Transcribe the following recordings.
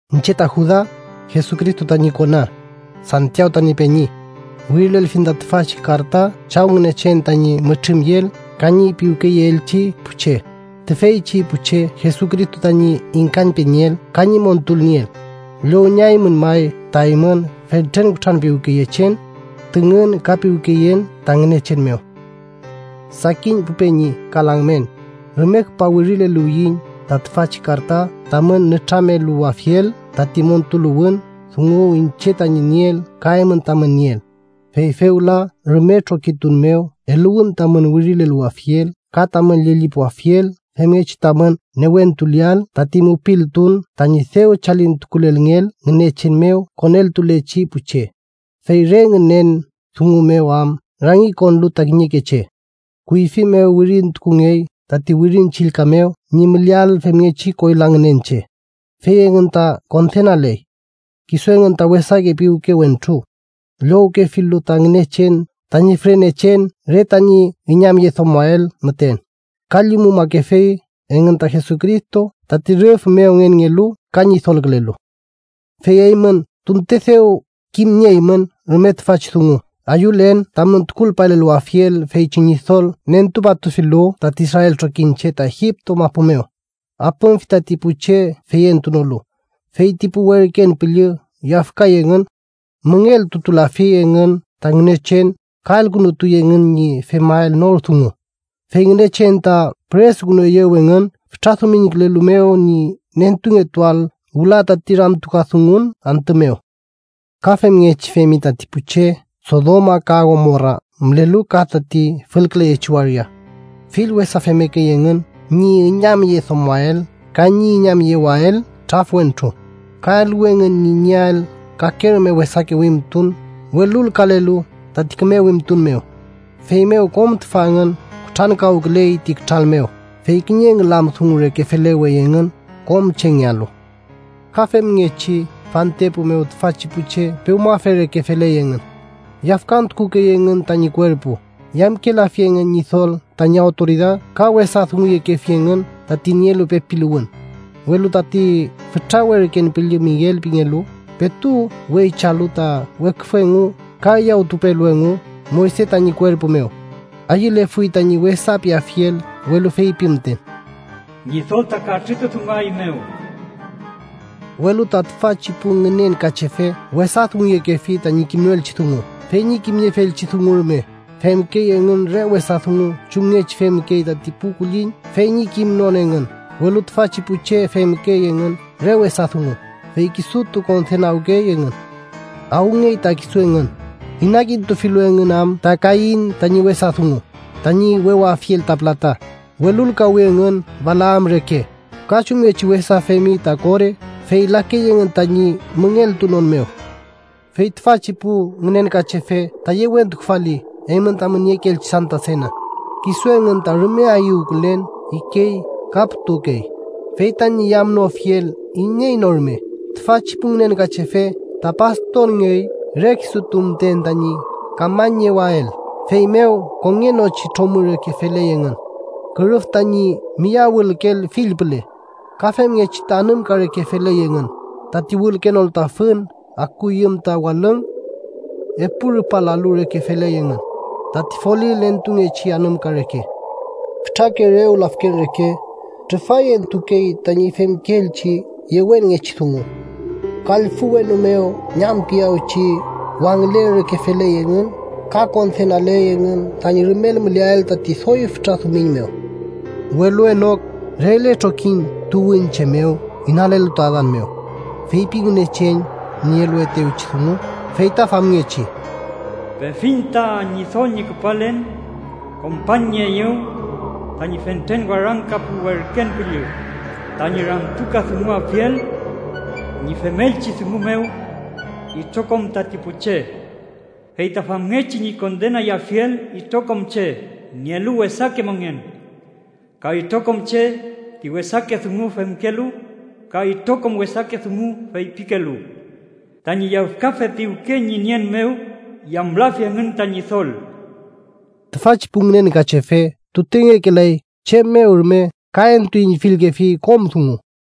Iñche ta Juda, Jesucristo tañi kona, Santiaw tañi peñi. Wirilelfiñ ta tüfachi karta Chaw Ngünechen tañi mütrümyeel ka ñi piwkeyeelchi pu che, tüfeychi pu che Jesucristo tañi ingkañpenieel ka ñi montulnieel. Llownieaymün may ta eymün fentren kutranpiwkeyechen, tüngün ka piwkeyen ta Ngünechen mew. Sakin pu peñi ka lamngen, rume küpa wirileluwiyiñ ta tüfachi karta tamün nütrameluwafiel tati montuluwün dungu iñche tañi nieel ka eymün tamün nieel. Fey fewla rume trokitun mew eluwün tamün wirileluwafiel ka tamün llellipuafiel femngechi tamün newentuleael tati mupiltun tañi dew chalintukulelngeel Ngünechen mew koneltulechi pu che. Fey re ngünen dungu mew am rangikonlu ta kiñeke che. Kuyfi mew wirintukungey tati Wirin Chillka mew ñi müleael femngechi koyla ngünen che, fey engün ta kondenaley. Kisu engün ta wesake piwke wentru, llowkefilu ta Ngünechen tañi fürenechen re tañi üñamyedomoael müten, ka llumumakefi engün ta Jesucristo tati rüf mew Ngenngelu ka Ñidolkülelu. Fey eymün tunte dew kimnieymün rume tüfachi dungu, ayülen tamün tukulpaleluwafiel feychi Ñidol nentupatufilu tati israel trokiñche ta Egipto mapu mew, apümfi tati pu che feyentunolu. Fey ti pu werken püllü yafkay engün, müngeltutulafi engün ta Ngünechen ka elkünutuy engün ñi femael nor dungu, fey Ngünechen ta püresukünueyew engün fütra dumiñkülelu mew ñi nentungetuael wüla tati ramtukadungun antü mew. Ka femngechi femi tati pu che Sodoma ka Gomora mülelu ka tati fülküleyechi waria. Fill wesa femmekey engün ñi üñamyedomoael ka ñi üñamyewael traf wentru. Ka eluwi engün ñi nieael kake rume wesake wimtun welulkalelu tati küme wimtun mew. Feymew kom tüfa engün kutrankawküley ti kütral mew, fey kiñe ngülam dungu reke felewey engün kom chengealu. Ka femngechi fantepu mew tüfachi pu che pewmafe reke feley engün. Yafkantukukey engün tañi kuerpu, yamkelafi engün Ñidol tañi awtoridad ka wesa dunguyekefi engün tati nielu pepiluwün. Welu tati fütra werken püllü Miguel pingelu, petu weychalu ta weküfü engu ka üyawtuwpelu engu Moyse tañi kuerpu mew, ayülefuy tañi wesa piafiel, welu feypi müten: “¡Ñidol ta katrütudunguaeymew!” Welu ta tüfachi pu ngünenkachefe wesa dunguyekefi tañi kimnoelchi dungu. Fey ñi kimniefielchi dungu rume, femkey engün re wesa dungu chumngechi femkey tati pu kulliñ fey ñi kimnon engün. Welu tüfachi pu che femkey engün re wesa dungu, fey kisutu kondenawkey engün. ¡Awngeay ta kisu engün!, inakintufilu engün am ta Kain tañi wesa dungu. Tañi wewafiel ta pülata, welulkawi engün Balaam reke. Ka chumngechi wesa femi ta Kore, fey lakey engün tañi müngeltunon mew. Fey tüfachi pu ngünenkachefe ta yewentukufali eymün tamün niekeelchi Santa Sena. Kisu engün ta rume ayüwkülen ikey ka putukey, fey tañi yamnofiel iney no rume. Tüfachi pu ngünenkachefe ta pastorngey re kisutu müten tañi kamañniewael. Feymew kongenochi tromü reke feley engün, kürüf tañi miyawülkeel fill püle. Ka femngechi ta anümka reke feley engün, tati wülkenolu ta fün akuyüm ta walüng. Epu rupa lalu reke feley engün, tati folil entungechi anümka reke. Fütrake rew lafken reke, trufay entukey tañi femkeelchi yewenngechi dungu. Kallfü wenu mew ñamkiyawchi wangülen reke feley engün ka kondenaley engün tañi rumel müleael tati doy fütra dumiñ mew. Welu Enok, regle trokiñ tuwünche mew inalelu ta Adan mew, feypi Ngünechen ñi eluetewchi dungu, fey ta famngechi: “Pefiñ ta Ñidol ñi küpalen. Kompañnieeyew tañi fentren warangka pu werken püllü, tañi ramtukadunguafiel ñi femelchi dungu mew itrokom tati pu che, fey ta famngechi ñi kondenayafiel itrokom che nielu wesake mongen, ka itrokom che ti wesake dungu femkelu ka itrokom wesake dungu feypikelu. Tañi yafkafe piwke ñi nien mew yamlafi engün ta Ñidol.” Tüfachi pu ngünenkachefe tutengekelay chem mew rume ka entuüñfilkefi kom dungu.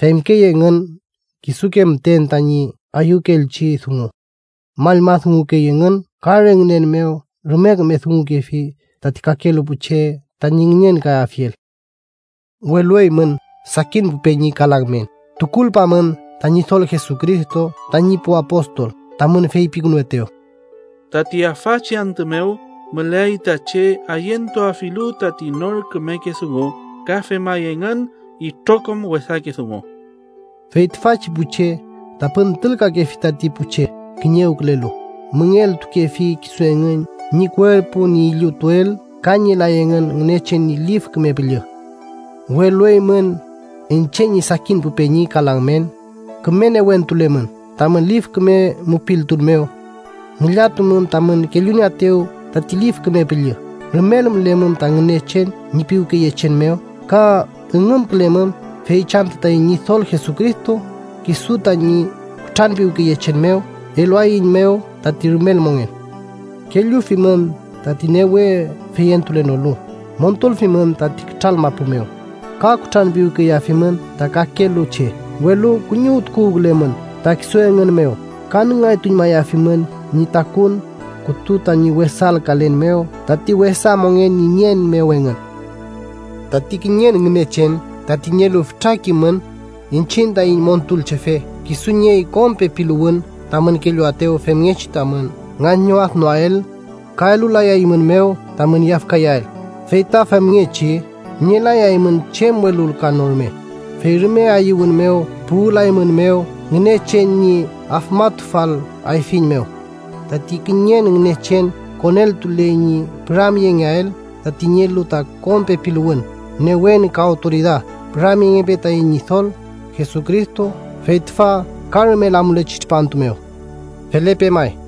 Femkey engün kisuke müten tañi ayükeelchi dungu. Mallma dungukey engün ka re ngünen mew rume küme dungukefi tati kakelu pu che tañi ngünenkayafiel. Welu eymün, sakin pu peñi ka lamngen, tukulpamün ta Ñidol Jesucristo tañi pu apostol tamün feypikünuetew: “Tati afachi antü mew müleay ta che ayentuafilu tati nor kümeke dungu ka femay engün itrokom wesake dungu.” Fey tüfachi pu che ta püntülkakefi tati pu che kiñewkülelu. Müngeltukefi kisu engün ñi kuerpu ñi illutuel ka nielay engün Ngünechen ñi Lif Küme Püllü. Welu eymün, iñche ñi sakin pu peñi ka lamngen, küme newentulemün tamün lif küme mupiltun mew. Ngillatumün tamün kellunieetew tati Lif Küme Püllü. Rumel mülemün ta Ngünechen ñi piwkeyechen mew, ka üngümkülemün feychi antü taiñ Ñidol Jesucristo, kisu tañi kutranpiwkeyechen mew, eluaeiñmew ta rumel mongen. Kellufimün tati newe feyentulenolu. Montulfimün tati kütral mapu mew, ka kutranpiwkeyeafimün ta kakelu che, welu kuñiwtuwkülemün ta kisu engün mew ka nüngaytuñmayafimün ñi takuwün kütu tañi wesalkalen mew tati wesa mongen ñi nien mew engün. Tati kiñen Ngünechen, tati nielu fütra kimün, iñchiñ taiñ Montulchefe, kisu niey kom pepiluwün tamün kelluaetew femngechi tamün ngañwadnoael, ka elulayaeymünmew tamün yafkayael, fey ta famngechi nielayaymün chem welulkan no rume, fey rume ayüwün mew puwülaeymünmew Ngünechen ñi afmatufal ayfiñ mew. Tati kiñen Ngünechen koneltuley ñi püramyengeael tati nielu ta kom pepiluwün, newen ka awtoridad. Püramyengepe taiñ Ñidol Jesucristo, fey tüfa ka rumel amulechi tripantu mew. Felepe may.